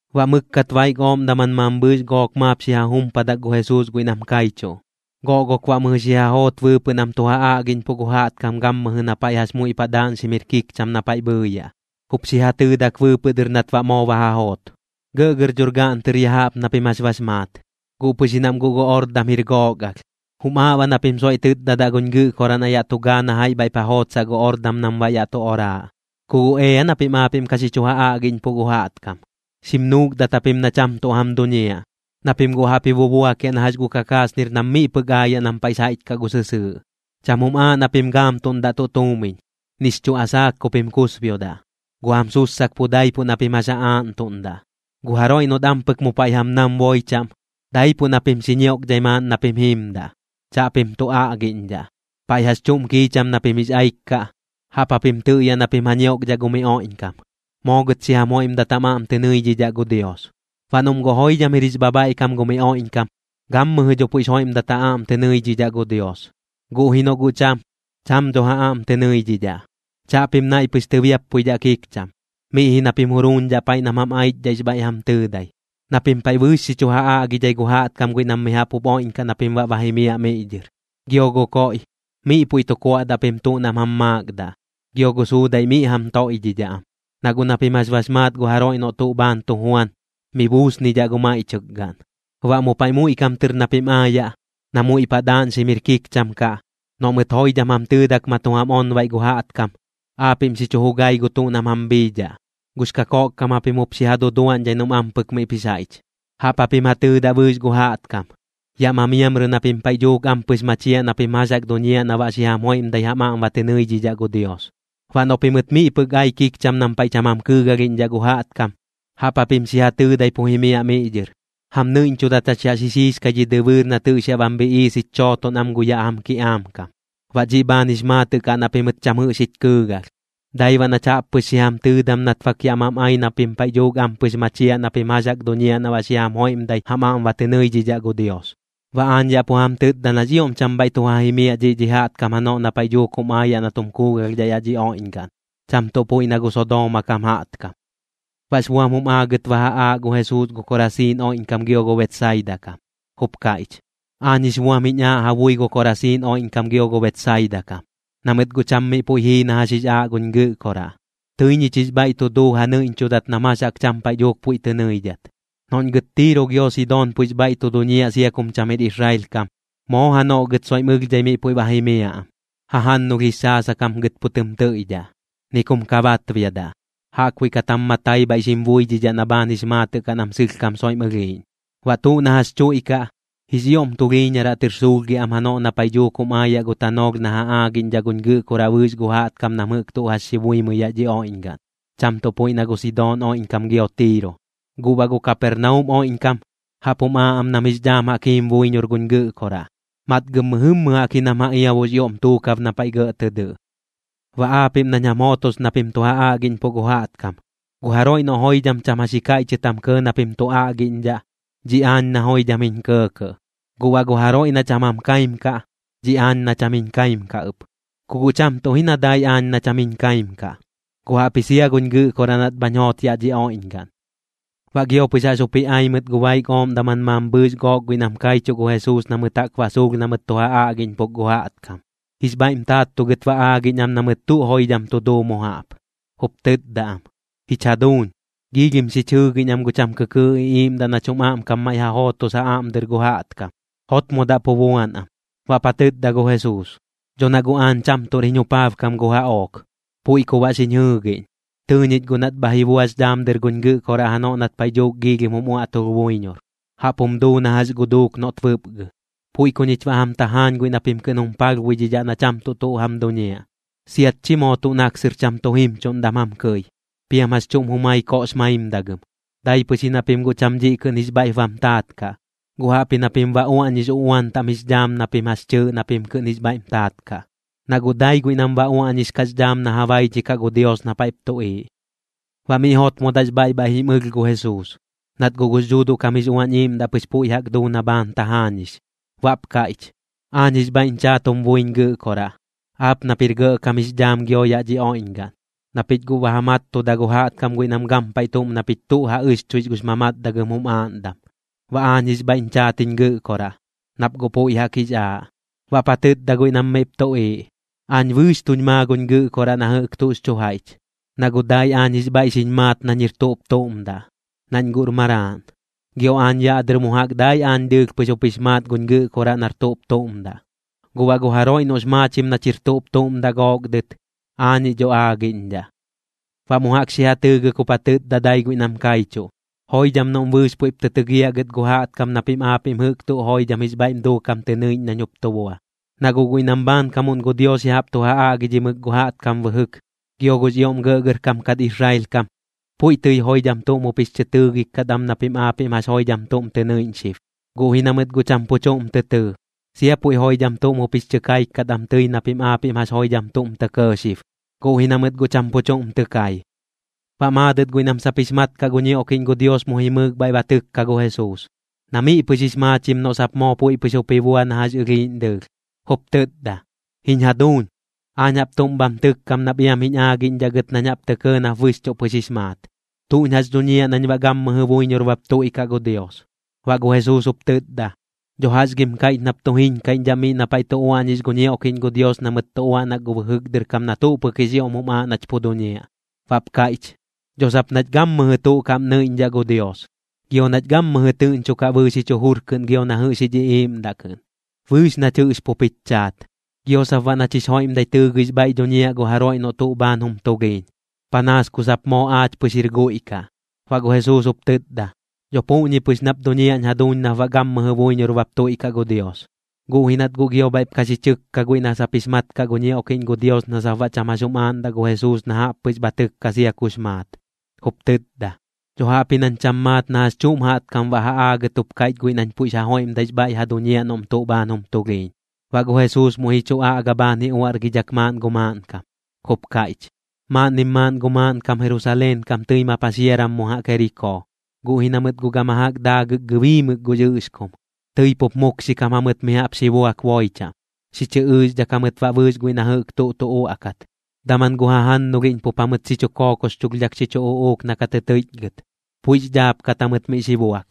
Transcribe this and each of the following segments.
Baꞌ mɨkkat baik ooꞌm daman mambhɨɨx gook maap xi ja jumpadak gu Jesuus guiꞌ nam kaichuꞌ, goꞌgok baꞌ mɨjɨ xi ja joot bɨɨpɨꞌ nam tu ja aꞌgiꞌñpuꞌ gu jaꞌtkam gammɨjɨ na paiꞌ jax muiꞌ paꞌ daaꞌñxim jir kikcham na paiꞌ bhɨɨyaꞌ. Jup xi ja tɨɨdak bɨɨpɨꞌ dɨr nat baꞌ moo ba ja joot: ―Gɇꞌgɇr dhor gaꞌn tɨr ya jaꞌp na pim jax bax maat, guꞌ pɨx ji nam guꞌ gu ordam jir gook alh. Jum aaꞌ baꞌ na pim soiꞌ tɨtdadaꞌ guñ Gɨꞌkoraꞌ na yaꞌ tu gaa na jaiꞌ bhaiꞌp ja jootsaꞌ gu ordam nam baꞌ yaꞌ tu oraaꞌ. Ku guꞌ ea na pim aapiꞌm ka xi chu ja aꞌgiꞌñpuꞌ gu jaꞌtkam. Xim nuukdat japim na cham tuꞌ jam duñiaꞌ, na pim guꞌ jaꞌp ji bubuakiaꞌ na jax gu kakasnir nam miꞌ pɨk aayaꞌ nam paiꞌx jaiꞌch kaꞌ gu sɨsɨɨꞌ. Cham jum aaꞌ na pim gaamtuꞌndaꞌ tuꞌ tuumiñ, nix chuꞌ asaak ku pim kusbiodaꞌ. Gu jam sussak pu daipuꞌ na pim jax ja aaꞌntuꞌndaꞌ. Gu jaroiꞌ noꞌt ampɨk mu paiꞌ jam nam boi chaꞌm, daipuꞌ na pim xi ñiokdhai maaꞌn na pim jiimdaꞌ, chaꞌpim tu aꞌgiꞌñdhaꞌ. Paiꞌ jax chuꞌm kiicham na pim jix aik kaꞌ, jaꞌp japim tɨꞌyaꞌ na pim ja ñioꞌkdhaꞌ gu mi oiꞌñkam: “Moo gɨt xi jam joiꞌmdat jam aꞌm tɨ nɨidhidhaꞌ gu Dios.” Baꞌ noꞌm guꞌ joidham jir jix bhabhaiꞌkam gu mi oiꞌñkam, gammɨjɨ dho puiꞌx joiꞌmdat ja aꞌm tɨ nɨidhidhaꞌ gu Dios, guꞌ ji noꞌ guꞌ cham, cham dho ja aꞌm tɨ nɨidhidhaꞌ. Chaꞌpim naiꞌ pɨx tɨbiappuidhaꞌ kikcham, miꞌ ji na pim juruuñdhaꞌ paiꞌ nam jam aichdhaꞌx bhaiꞌ jam tɨɨdai. Na pim paiꞌ bɨɨx xi chu ja aꞌgidhai gu jaꞌtkam guiꞌ nam mi jaꞌp jup oiꞌñkaꞌ na pim baꞌ ba jimiaꞌ miꞌ dhɨr. Gio gu koiꞌ, miꞌ puiꞌ tu kuaꞌdaꞌ pim tuꞌ nam jam maakdaꞌ, gio gu suudaiꞌ miꞌ jam toiꞌdhidhaꞌ am, na guꞌ na pim jax bax maat gu jaroiꞌ noꞌ tuꞌ bhaan tu juan, mi buusnidhaꞌ gu maiꞌchɨk gaꞌn. Baꞌ mu paiꞌ muiꞌ kam tɨr na pim aayaꞌ, na muiꞌ paꞌ daaꞌñxim jir kikcham kaꞌ, noꞌ mɨt joidham jam tɨɨdak ma tu jam onbaiꞌ gu jaꞌtkam, aapiꞌm xi chu jugai gu tuꞌ nam jam bhiidhaꞌ. Gux kakoꞌkkam japim jup xi ja duduaꞌñdhai noꞌm ampɨk miꞌp jix jaiꞌch. Jaꞌp japim ja tɨɨdaꞌ bɨɨx gu jaꞌtkam: “Yaꞌ ma miamrɨ na pim paiꞌ dhuuk ampɨx machiaꞌ na pim jax jaꞌk duñiaꞌ na baꞌ xi jam joiꞌmdai jam aꞌm ba tɨ nɨidhidhaꞌ gu Dios.” Baꞌ noꞌ pimɨt miꞌ pɨk ai kikcham nam paiꞌ cham jam kɨɨgalhiꞌñdhaꞌ gu jaꞌtkam, jaꞌp japim xi ja tɨɨdai pu jimiaꞌ miꞌ dhɨr: “Jam nɨiꞌñchudat jach yaꞌ xi xiixkai dhi dɨbɨɨr nat jɨꞌx yaꞌ bam bhiꞌiis jich chooton am gu yaꞌ jam kiꞌaam kam, baꞌ dhiꞌ bhaan jix maatɨꞌ kaꞌ na pimɨt cham jɨꞌx jich kɨɨgalh. Dai baꞌ nach jaꞌp pɨx xi jam tɨɨdam nat bak yaꞌ mam ai na pim paiꞌ dhuuk ampɨx machiaꞌ na pim jax jaꞌk duñiaꞌ na baꞌ xi jam joiꞌmdai jam aꞌm ba tɨ nɨidhidhaꞌ gu Dios.” Baꞌ aañ yaꞌ pu jam tɨtda nax ioꞌm cham bhaiꞌ tu ja jimiaꞌ dhiꞌ dhi jaꞌtkam janoꞌ na paiꞌ dhuuk jum aayaꞌ na tum kuugalhdhaꞌ yaꞌ dhi oiꞌñgaꞌn, cham tuꞌ puiꞌ na gu Sodooma kam jaꞌtkam. Baꞌx buam jum aagɨt ba ja aaꞌ gu Jesuus gu Korasiin oiꞌñkam gio gu Betsaida kam, jup kaiꞌch: ―Aañ jix buam jiñ aaꞌ ja bui gu Korasiin oiꞌñkam gio gu Betsaida kam, na mɨt guꞌ cham miꞌ puiꞌ jii na jax jix aaꞌ guñ Gɨꞌkoraꞌ. Tɨi ñich jix bhaiꞌ tu duu ja nɨiꞌñchudat nam jax jaꞌk cham paiꞌ dhuuk puiꞌ tɨ nɨidhat. Noꞌñ gɨt Tiiro gio Sidoon puiꞌx bhaiꞌ tu duñiaꞌ sia kum cham jir Israel kam, moo janoꞌ gɨt soiꞌm ɨlhdhai miꞌ puiꞌ ba jimiaꞌ am. Jajannulh jix xaasak jam gɨt pu tɨm tɨiꞌdhaꞌ, ni kum ka batbiadaꞌ, jaꞌkbuiꞌ kat jam matai bhaiꞌ xim buidhidhaꞌ na bhaan jix maatɨꞌ kaꞌ nam sɨlhkam soiꞌm ɨlhiiꞌñ. Baꞌ tuꞌ na jax chuiꞌkaꞌ, jix ioꞌm tulhiiñaraꞌ tɨr suulhgiaꞌ am janoꞌ na paiꞌ dhuuk jum aayaꞌ gu tanoolh na ja aagiꞌñdhaꞌ guñ Gɨꞌkoraꞌ bɨɨx gu jaꞌtkam nam jɨꞌk tuꞌ jax xi buimɨi yaꞌ dhi oiꞌñgaꞌn, cham tuꞌ puiꞌ na gu Sidoon oiꞌñkam gio Tiiro. Guꞌ baꞌ gu Kapernaum oiꞌñkam, jaꞌp jum aaꞌ am nam jix dhaam jaꞌk jiim buiñor guñ Gɨꞌkoraꞌ. Matgɨm mɨjɨmmɨ jaꞌk ji nam ja iabuꞌx ioꞌm tuukab na paiꞌ gɇꞌ tɨ dɨꞌ. ’Baꞌ aapiꞌm nañ jam jootos na pim tu ja aꞌgiꞌñpuꞌ gu jaꞌtkam, gu jaroiꞌ noꞌ joidham cham jax ji kaiꞌchɨt jam kɇɇ na pim tu aꞌgiꞌñdhaꞌ, dhiꞌ aañ na joidham jiñ kɇɇkɇꞌ. Guꞌ baꞌ gu jaroiꞌ na cham jam kaim kaꞌ, dhiꞌ aañ na cham jiñ kaim kaꞌ ɨp. Ku guꞌ cham tuꞌ ji na dai aañ na cham jiñ kaim kaꞌ, guꞌ jaꞌpji sia guñ Gɨꞌkoraꞌ nat bhañ joot yaꞌ dhi oiꞌñgaꞌn. Baꞌ gio pɨx jaꞌx jup ji ai mɨt gu baik ooꞌm daman mambhɨɨx gook guiꞌ nam kaichuꞌ gu Jesuus na mɨt jaꞌk ba suulh na mɨt tu ja aꞌgiꞌñpuk gu jaꞌtkam. Jix bhaiꞌm taattugɨt ba aagiꞌñ am na mɨt tuꞌ joidham tu duu mu jaꞌp, jup tɨtda am: ―¡Jich jaduuñ, giilhim xich jɨɨgiꞌñ am gu cham kɨkɨɨꞌ iꞌiiꞌmdaꞌ nach jum aꞌmkam maiꞌ ja jootos ja aꞌm dɨr gu jaꞌtkam! ¡Jotmodaꞌ pu buan am! Baꞌp ja tɨtda gu Jesuus: ―Dho na guꞌ aañ cham tuꞌr jiñ jupaabkam gu jaꞌook, puiꞌ ku baꞌ xiñ jɨɨgiꞌñ. Tɨɨ ñich guꞌ nat bha ji buax dhaam dɨr guñ Gɨꞌkoraꞌ janoꞌ nat paiꞌ dhuuk giilhim jum uaꞌtulh buiñor, jaꞌp jum duu na jax gu duuk noꞌt bɨpgɨ. Puiꞌ ku ñich baꞌ aañ jam tajaañ guiꞌ na pim kɨꞌn jum palhbuidhidhaꞌ na cham tuꞌ tuꞌ jam duñiaꞌ, siat chi moo tuꞌ naksɨr cham tu jimchuꞌndam jam kɨi, piam jax chuꞌm jumai koꞌx maimdagɨm. Dai pɨx ji na pim guꞌ cham dhiꞌ kɨꞌn jix bhaiꞌp bam taat kaꞌ, guꞌ jaꞌpji na pim ba uaꞌñix uꞌuan taꞌm jix dhaam na pim jax chɨɨꞌ na pim kɨꞌn jix bhaiꞌm taat kaꞌ, na guꞌ dai guiꞌ nam ba uaꞌñix kaꞌx dhaam na ja baidhikaꞌ gu Dios na paiꞌp tuꞌiiꞌ. Baꞌ miꞌ jotmodaꞌx bhaiꞌ bhaiꞌ jim ɨlh gu Jesuus, nat guꞌ gux Dhuuduꞌ kam jix Uañ Iiꞌmdaꞌ pɨx puiꞌ jaꞌk duu na bhaan tajaañix. Baꞌp kaiꞌch: ―Aañ jix bhaiꞌñ chaat jum buiñ Gɨꞌkoraꞌ, aap nap jir gɇꞌkam jix dhaam gio yaꞌ dhi oiꞌñgaꞌn, na pich guꞌ ba ja mattuda gu jaꞌtkam guiꞌ nam gampaiꞌ tuꞌm na pich tuꞌ ja ɨxchuix gux mamatdagɨm jum aaꞌndam. Baꞌ aañ jix bhaiꞌñ chaat jiñ Gɨꞌkoraꞌ, nap guꞌ puiꞌ jaꞌk jix aaꞌ. Baꞌp ja tɨtda guiꞌ nam miꞌp tuꞌiiꞌ: ―Aañ bɨɨx tuñ maa guñ Gɨꞌkoraꞌ na jɨꞌk tuꞌx chu jaiꞌch, na guꞌ dai aañ jix bhaiꞌ xiñ maat nañ jir tuꞌp tuꞌm daꞌ, nañ guꞌr maraaꞌn. Gio aañ yaꞌ dɨr mu jaꞌk dai aañ dɨɨlh pɨx jup jix maat guñ Gɨꞌkoraꞌ nar tuꞌp tuꞌm daꞌ. Guꞌ baꞌ gu jaroiꞌ noꞌx maachim nach jir tuꞌp tuꞌm daꞌ gook dɨt, aañiꞌ dho aagiꞌñdhaꞌ. Baꞌ mu jaꞌk xi ja tɨɨgɨk jup ja tɨtda dai guiꞌ nam kaichuꞌ: ―Joidham noꞌm bɨɨx puiꞌp tɨ tɨgiaꞌ gɨt gu jaꞌtkam na pim aapiꞌm jɨꞌk tuꞌ joidham jix bhaiꞌm duukam tɨ nɨiꞌñ nañ jup tu bua. Na guꞌ guiꞌ nam bhaankamuꞌn gu Dios ya jaꞌp tu ja aꞌgidhimɨk gu jaꞌtkam bɨjɨk, gio gux ioꞌm gɇꞌgɇrkam kat Israel kam, puiꞌ tɨi joidham tuꞌm jup jix chɨ tɨɨgik kat am na pim aapiꞌm jax joidham tuꞌm tɨ nɨiꞌñ xib, guꞌ ji na mɨt guꞌ cham pu chuꞌm tɨ tɨɨ. Sia puiꞌ joidham tuꞌm jup jix chɨ kaik kat am tɨi na pim aapiꞌm jax joidham tuꞌm tɇ kɇɇ xib, guꞌ ji na mɨt guꞌ cham pu chuꞌm tɨ kai. Baꞌ maadɨt guiꞌ nam sap jix mat kaꞌ gu ñioꞌkiꞌñ gu Dios mu jimɨɨk bhaiꞌ ba tɨkka gu Jesuus, na miꞌ pɨx jix maachim noꞌ sap moo puiꞌ pɨx jup ji bua na jax ɨlhiiꞌñ dɨɨlh. Jup tɨtda: ―Jiñ jaduuñ, aañ jaꞌp tuꞌm bham tɨkkam nap iam jiñ aagiꞌñdhaꞌ gɨt nañ jaꞌp tɇ kɇɇ nap bɨxchuꞌ pɨx jix maat. ¿Tuꞌñ jax dhuñiaꞌ nañ baꞌ gammɨjɨ buiñor bap tuiꞌkaꞌ gu Dios? Baꞌ gu Jesuus jup tɨtda: ―¿Dho jax gim kaiꞌch nap tu jiñkaiꞌñdhaꞌ miꞌ na paiꞌ tu uaꞌñix gu ñioꞌkiꞌñ gu Dios na mɨt tu uaꞌnak gu bɨjɨk dɨr kam na tuꞌ pɨk jix ioꞌm jum aaꞌ nach pu duñiaꞌ? Baꞌp kaiꞌch: ―Dho sap nach gammɨjɨ tuꞌ kaꞌm nɨiꞌñdhaꞌ gu Dios, gio nach gammɨjɨ tɨꞌñchokaꞌ bɨɨx jich jujur kɨꞌn gio na jɨꞌx jich iꞌiiꞌmdaꞌ kɨꞌn, bɨɨx nach jɨꞌx pup jich chaat. Gio sap baꞌ nach jix joiꞌmdai tɨɨgɨix bhaiꞌ dhuñiaꞌ gu jaroiꞌ noꞌ tuꞌ bhaan jum tulhiiñ, panaas ku sap moo aach pɨx jir guiꞌ kaꞌ. Baꞌ gu Jesuus jup tɨtda: ―Dho puꞌñi pɨx nap duñiaꞌñ jaduuñ nap baꞌ gammɨjɨ buiñor bap tuiꞌkaꞌ gu Dios. Guꞌ ji nat guꞌ gio bhaiꞌp ka xi chɨkka guiꞌ na sap jix mat kaꞌ gu ñioꞌkiꞌñ gu Dios na sap baꞌ cham jax jum aaꞌndaꞌ gu Jesuus na jaꞌp pɨx bha tɨkka sia kux maat, jup tɨtda: ―Dho jaꞌpji nañ cham maat na jax chuꞌm jaꞌtkam baꞌ ja aagɨt jup kaiꞌch guiꞌ nañ puiꞌx ja joiꞌmdaix bhaiꞌ ja duñiaꞌ noꞌm tuꞌ bhaan jum tulhiiñ. Baꞌ gu Jesuus muiꞌ ji chu aꞌga bhaan ji uaꞌrgidhak maaꞌn gu maaꞌnkam, jup kaiꞌch: ―Maaꞌnnim maaꞌn gu maaꞌnkam Jerusaleen kam tɨi ma paxiaram mu jaꞌk Jerikoo. Guꞌ ji na mɨt guꞌ gama jaꞌk daagɨk gɨbiimɨk gux ɨꞌxkum, tɨi pup mukxikam jamɨt mi jaꞌp xi buak boi chaꞌm, xi chɨ ɨɨxdhak jamɨt baꞌ bɨɨx guiꞌ na jɨꞌk tuꞌ tu uaꞌkat. Daman gu jajannulhiꞌñ pup jamɨt xi chu kookoxchulhdhak xi chu uꞌuuk na ka tɨ tɨiꞌchgɨt, puiꞌx dhaapkat jamɨt miꞌ xi buak.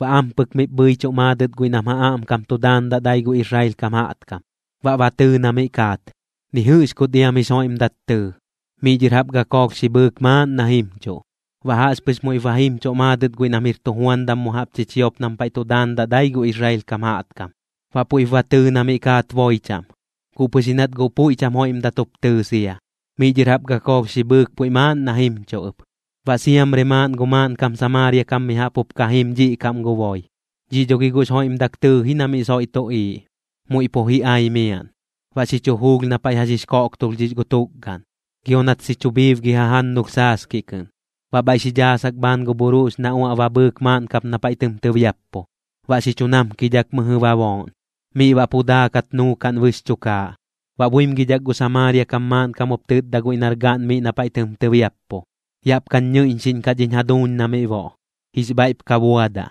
Baꞌ ampɨk miꞌp bhɨichuꞌ maadɨt guiꞌ nam ja aꞌmkam tu daandaꞌ dai gu Israel kam jaꞌtkam. Baꞌ ba tɨɨ na miꞌ kaat, ni jɨꞌx kut iam jix joiꞌmdat tɨɨ. Miꞌ dhɨr jaꞌp gakoolh xi bhɨɨk maaꞌn na jimchuꞌ. Baꞌ jaꞌxpɨx muiꞌp ba jimchuꞌ maadɨt guiꞌ nam jir tujuandam mu jaꞌp chichiop nam paiꞌ tu daandaꞌ dai gu Israel kam jaꞌtkam. Baꞌ puiꞌp ba tɨɨ na miꞌ kaat boi chaꞌm, guꞌ pɨx ji nat guꞌ puiꞌ cham joiꞌmdat jup tɨɨ sia, miꞌ dhɨr jaꞌp gakoolh xi bhɨɨk puiꞌ maaꞌn na jimchuꞌ ɨp. Baꞌ siamri maaꞌn gu maaꞌnkam Samaaria kam mi jaꞌp jup ka jim dhiꞌ kaꞌm gu boi. Dhiꞌ dho gi guꞌx joiꞌmdak tɨɨ ji na miꞌ soiꞌ tuꞌiiꞌ, muiꞌ pu ji ai miaꞌn. Baꞌ xi chu juulh na paiꞌ jax jix koꞌktulhdhix gu tukgaꞌn, gio nat xi chu bhiibgi jajannulh saaskiꞌ kɨꞌn. Baꞌ bhaiꞌ xi dhaasak bhaan gu bhuruꞌx na uaꞌ ba bhɨɨk maaꞌn kap na paiꞌ tɨm tɨbiappu, baꞌ xi chu namkidhak mɨjɨ ba booꞌn. Miꞌ baꞌ pu daakat nuukaꞌn bɨx chukaaꞌ. Baꞌ buimgidhak gu Samaaria kam maaꞌnkam jup tɨtda guiꞌ nar gaꞌn miꞌ na paiꞌ tɨm tɨbiappu: “Yaꞌp kañ ñɨiꞌñxiꞌñkaꞌ dhiñ jaduuñ na miꞌ boꞌ, jix bhaiꞌp ka buadaꞌ.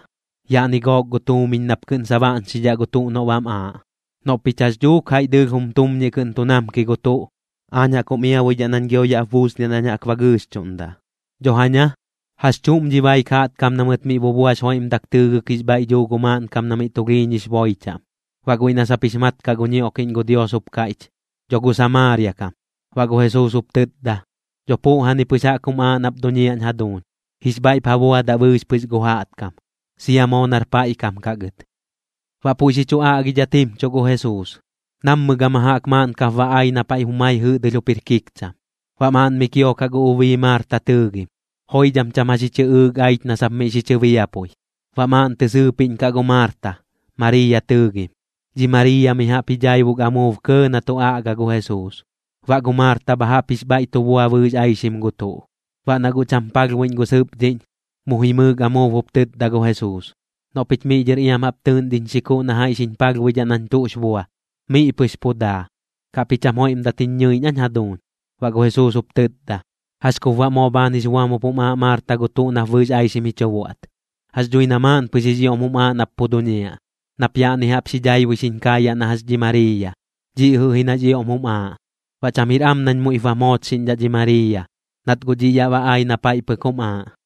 Yaꞌni gook gu tuumiñ nap kɨꞌn sabaꞌñxidhaꞌ gu tuꞌ noꞌ bam aaꞌ. Noꞌ pich jax dhuuk jaiꞌ dɨɨlh jum tumñiꞌ kɨꞌn tu namki gu tuꞌ, aañ jaꞌk jum iabuidhaꞌ nañ gio yaꞌp buusniaꞌ nañ jaꞌk ba gɨɨxchuꞌndaꞌ.” Dho jaña, ¿jax chuꞌm dhi baik jaꞌtkam na mɨt miꞌ bubuax joiꞌmdak tɨɨgɨk jix bhaiꞌ dhuu gu maaꞌnkam na miꞌ tulhiiñix boi chaꞌm? Baꞌ guiꞌ na sap jix mat kaꞌ gu ñioꞌkiꞌñ gu Dios jup kaiꞌch: ―Dho gu Samaaria kam. Baꞌ gu Jesuus jup tɨtda: ―Dho puꞌjani pɨx jaꞌk jum aaꞌ nap duñiaꞌñ jaduuñ, jix bhaiꞌp ja buadaꞌ bɨɨx pɨx gu jaꞌtkam, sia moo nar paiꞌ kam kaꞌ gɨt. Baꞌ puiꞌ xi chu aꞌgidhat jimchuꞌ gu Jesuus. Nammɨ gama jaꞌk maaꞌn kap ba ai na paiꞌ jumai jɨꞌdɨlh jup jir kikcham. Baꞌ maaꞌn miꞌ kiokaꞌ gu ubii Maarta tɨɨgim, joidham cham jax ji chɨꞌɨɨk aich na sap miꞌ xi chɨbiapui. Baꞌ maaꞌn tɨ sɨɨpiꞌñ kaꞌ gu Maarta, Mariiya tɨɨgim. Dhi Mariiya mi jaꞌp ji dhaibuk amuub kɇɇ na tu aꞌga gu Jesuus. Baꞌ gu Maarta bha jaꞌp jix bhaiꞌ tu bua bɨɨx aixim gu tuꞌ. Baꞌ na guꞌ cham palhbuiꞌñ gu sɨpdhiꞌñ, mu jimɨɨk amuub jup tɨtda gu Jesuus: ―Noꞌ pich miꞌ dhɨr iam jaꞌp tɨɨꞌn dhiñ xikuꞌ na jaiꞌ xiñ palhbuidhaꞌ nañ tuꞌx bua. Miꞌ pɨx pu daa. ¿Kaꞌp ji cham joiꞌmdat jiñ ñɨiꞌñ aañ jaduuñ? Baꞌ gu Jesuus jup tɨtda: ―¿Jax kup baꞌ moo bhaan jix buam jup jum aaꞌ Maarta gu tuꞌ nap bɨɨx aixim ji chu buaꞌt? Jax dhui na maaꞌn pɨx jix ioꞌm jum aaꞌ nap pu duñiaꞌ, nap yaꞌni jaꞌp daibui xiñ kaayaꞌ na jax dhi Mariiya. Dhiꞌ jɨꞌ ji nax ioꞌm jum aaꞌ. Baꞌ cham jir am nañ muiꞌp bam joochxiꞌñdhaꞌ dhi Mariiya, nat guꞌ dhiꞌ yaꞌ ba ai na paiꞌ pɨk jum aaꞌ.